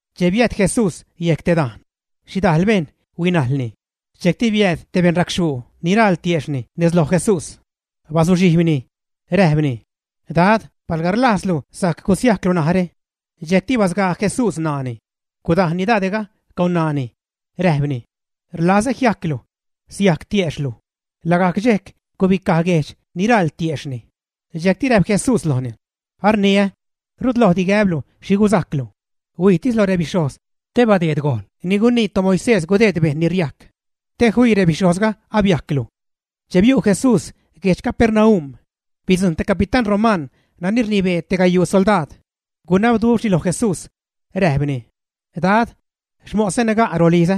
Che biäjt Jesús yec dajn, xhidajl bejṉ huinajlni. Dxejcti biääd te beṉracxhuu ni raḻ tiejxhni nez loj Jesús. Bazuxhijbni, räjpni: ―Dad, palga rlajzlu, sajc gusiajclu narä. Dxejcti basgaa Jesús ṉaani, gudajnni dade'ga con ṉaani, räjpni: ―Rlazä jiajclu. Siajc tiejxhlu. Lagajc dxejc gubicaj guejdx ni raḻ tiejxhni. Dxejcti räjp Jesús lojni: ―Arniä, rut lojdi gäblu xhi guzajclu. Huijtis lo rebixhojz te badeed gojn ni gunii toMoisés gudeed bejṉ ni riajc, te fii rebixhojzga abiajclu. Che biu' Jesús guedx Capernaum, bidzujṉ te capitán romaṉ nani rnibee te gayuu soldaad. Gunabduxhni lo Jesús, räjpni: ―Dad, xmosä naga' rolizä.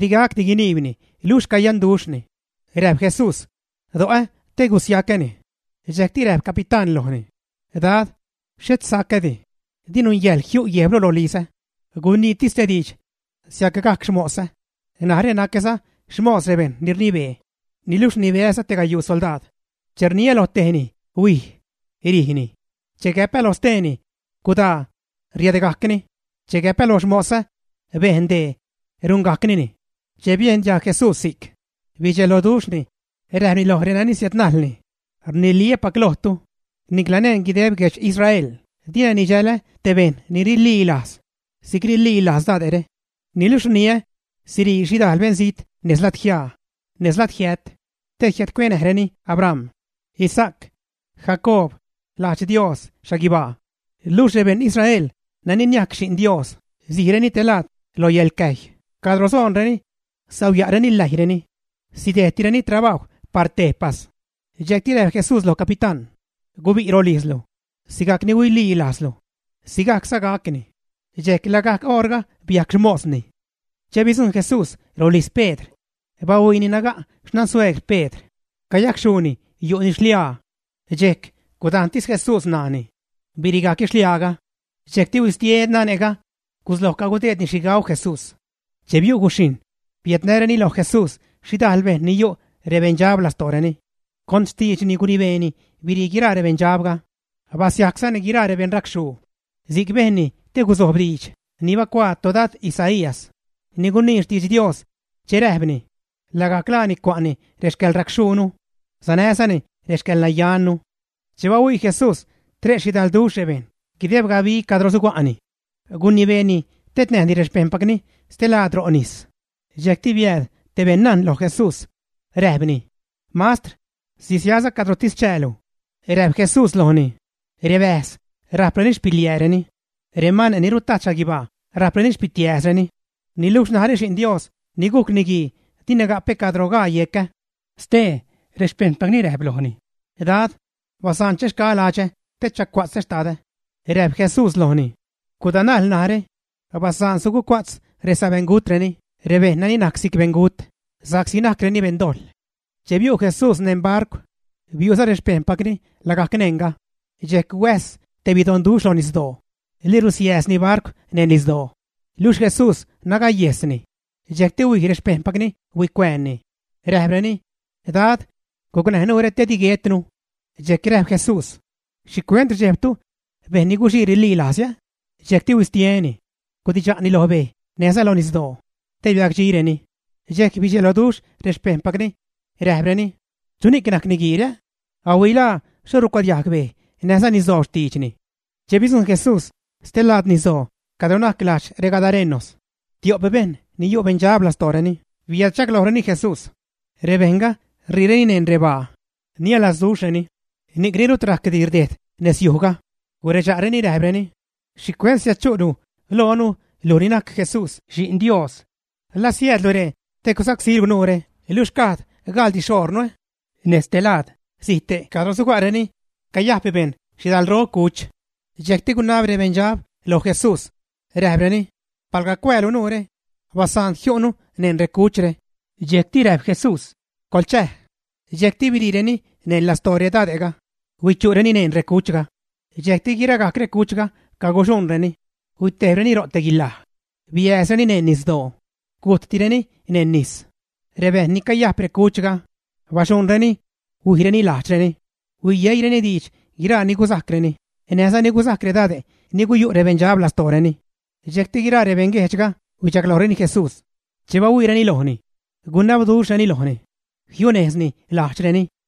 Di gacdi guiniibni luxh cayanduxhni. Räjp Jesús: ―Do'o te gusiacäni. Dxejcti räjp capitán lojni: ―Dad, xhet sacädi; di nungäjḻ jiu' guejblu rolizä. Guiniitis te diidx, siacgajc xmosä. Narä nacäza xmos rebejṉ ni rnibee, niluxh rnibeäza te gayuu soldaad. Che rniä lo tejni: “Huij”, rijni. Che gäpä loj steeni: “Gudaa”, riädgajcni. Che gäpä loj xmosä: “Bejn dee”, rungajcnini. Che biejn diajg Jesús si'c, bidxeloduxhni, räjpni loj renani siädnajlni: ―Rniliä́pac lojtu, nicla neṉ guideb reguedx Israel dina nidxälä te bejṉ ni rililajz si'c rililajz dade're. Niluxh rniä, sirii xhidajl beṉzijt nez ladjiaa, nez ladjiät, te jiädcuenäjreni Abram, Isaac, Jacoob lajdx Dios xhaguibaa. Luxh rebeṉ Israel nani niajc xi'n Dios sijreni te laad lo yäḻcäjy cadro soonreni, sauya'reni läjyreni, sidejdtisreni trabajw par tejpas. Dxejcti räjp Jesús loj capitán: ―Gubi' rolijzlu. Sigajcni huililajzlu, sigajcza gacni. Dxejc lagajc oṟga biajc xmosni. Che bidzujṉ Jesús rolijz Pedr, bahuiini naga' xnansueegr Pedr, cayacxhuuni, yu'ni xliaa. Dxejc gudajntis Jesús ṉaani, birigajcni xliaaga. Dxejcti huistie nane'ga, gusloj cagudeedni xhi gau Jesús. Che biu' guxhijṉ, biädnäreni loj Jesús xhidajl bejṉ ni yu' rebeṉdxab lostooreni; con xtiidxni gunibeeni birii guiraa rebeṉdxabga. Basiajczani guiraa rebeṉ racxhuu. Si'c bejnni te guzojb diidx ni bacuaa todad Isaías, ni gunii xtidx Dios, che räjpni: Lagajc laani cua'ni rexcäḻracxhuunu, sanäzani rexcäḻnayannu. Che bahuii Jesús tre' xhidalduxh rebejṉ guideb gabi cadro suga'ni, gunibeeni tednäjni rexpejṉpacni stelaad ro' nis. Dxejcti biääd te beṉnajn loj Jesús, räjpni: ―Mastr, sisiaäza cadrotis chäälu. Räjp Jesús lojni: ―Rebäjz rajpreni xpiliääreni, remane' ni rutajt xhaguibaa rajpreni xpitiääzreni, niluxh narä Xi'n Dios ni gujc Niguii dina gapä cadro gaa yecä. Stee rexpejṉpacni räjp lojni: ―Dad, basaan chaxgaä ladxä te chacuatzä xtadä. Räjp Jesús lojni: ―Gudanajl narä. Basaan sugucua'tz resabeṉgutreni rebejṉ nani najc si'c beṉgut sa'csi najcreni beṉdojḻ. Che biu' Jesús neṉ barcw, biu'za rexpejṉpacni lagajc neṉga. Dxejc huäjs te bedonduxh lo nisdoo. Lirusiääzni barcw neṉ nisdoo. Luxh Jesús nagayejsni. Dxejcti huij rexpejṉpacni huicuäänni, räjpreni: ―Dad, gucnäj nuure te di guetnu. Dxejc räjp Jesús: ―¿Xhicuent rdxejbtu, bejṉ ni guxii rililajz? Dxejcti huistieni, gudidxa'ni lo bej näjza lo nisdoo, te biacdxireni. Dxejc bidxeloduxh rexpejṉpacni, räjpreni: ―¿Chuni'c najc niguiire? ¡Ahuilaa xho rucuadiajg bej näjza nisdoo xtiidxni! Che bidzujṉ Jesús stelaad nisdoo cadro najc lajdx regadarenos, tio'p bejṉ ni yu' beṉdxab lastooreni biädchaglojreni Jesús. Rebejṉga riireni neṉ rebaa, nialazduxhreni, ni'cni rut rajcdi rdejd nezyujga. Guredxa'reni räjpreni: ―¿Xhicuent siädchu'lu loonu luj ni najc Jesús Xi'n Dios? ¿La siäädlu ree te gusacsílu nuure luxh gad gaḻdi xoṟnu, ä? Nez te laad, zijte' cadro suga'reni, cayajp bejṉ xhidalro cuch. Dxejcti gunab rebeṉdxabga loj Jesús, räjpreni: ―Palga cuäälu nuure, basaan jiu'nu neṉ recuchre. Dxejcti räjp Jesús: ―Coḻchäj. Dxejcti biriireni neṉ lastoo redade'ga, huichu'reni neṉ recuchga. Dxejcti guiragajc recuchga caguxuṉreni, huitejbreni ro' te guilaj, biääzreni neṉ nisdoo, gujttireni neṉ nis. Rebejṉ ni cayajp recuchga, baxuṉreni, huijreni lajdxreni, huiyeireni diidx guiraa ni guzajcreni näjza ni guzajc redade' ni guyu' rebeṉdxab lastooreni. Dxejcti guiraa rebeṉguejdxga huichaglojreni Jesús. Che bahuiireni lojni, gunabduxhreni lojni, jiunejzni lajdxreni.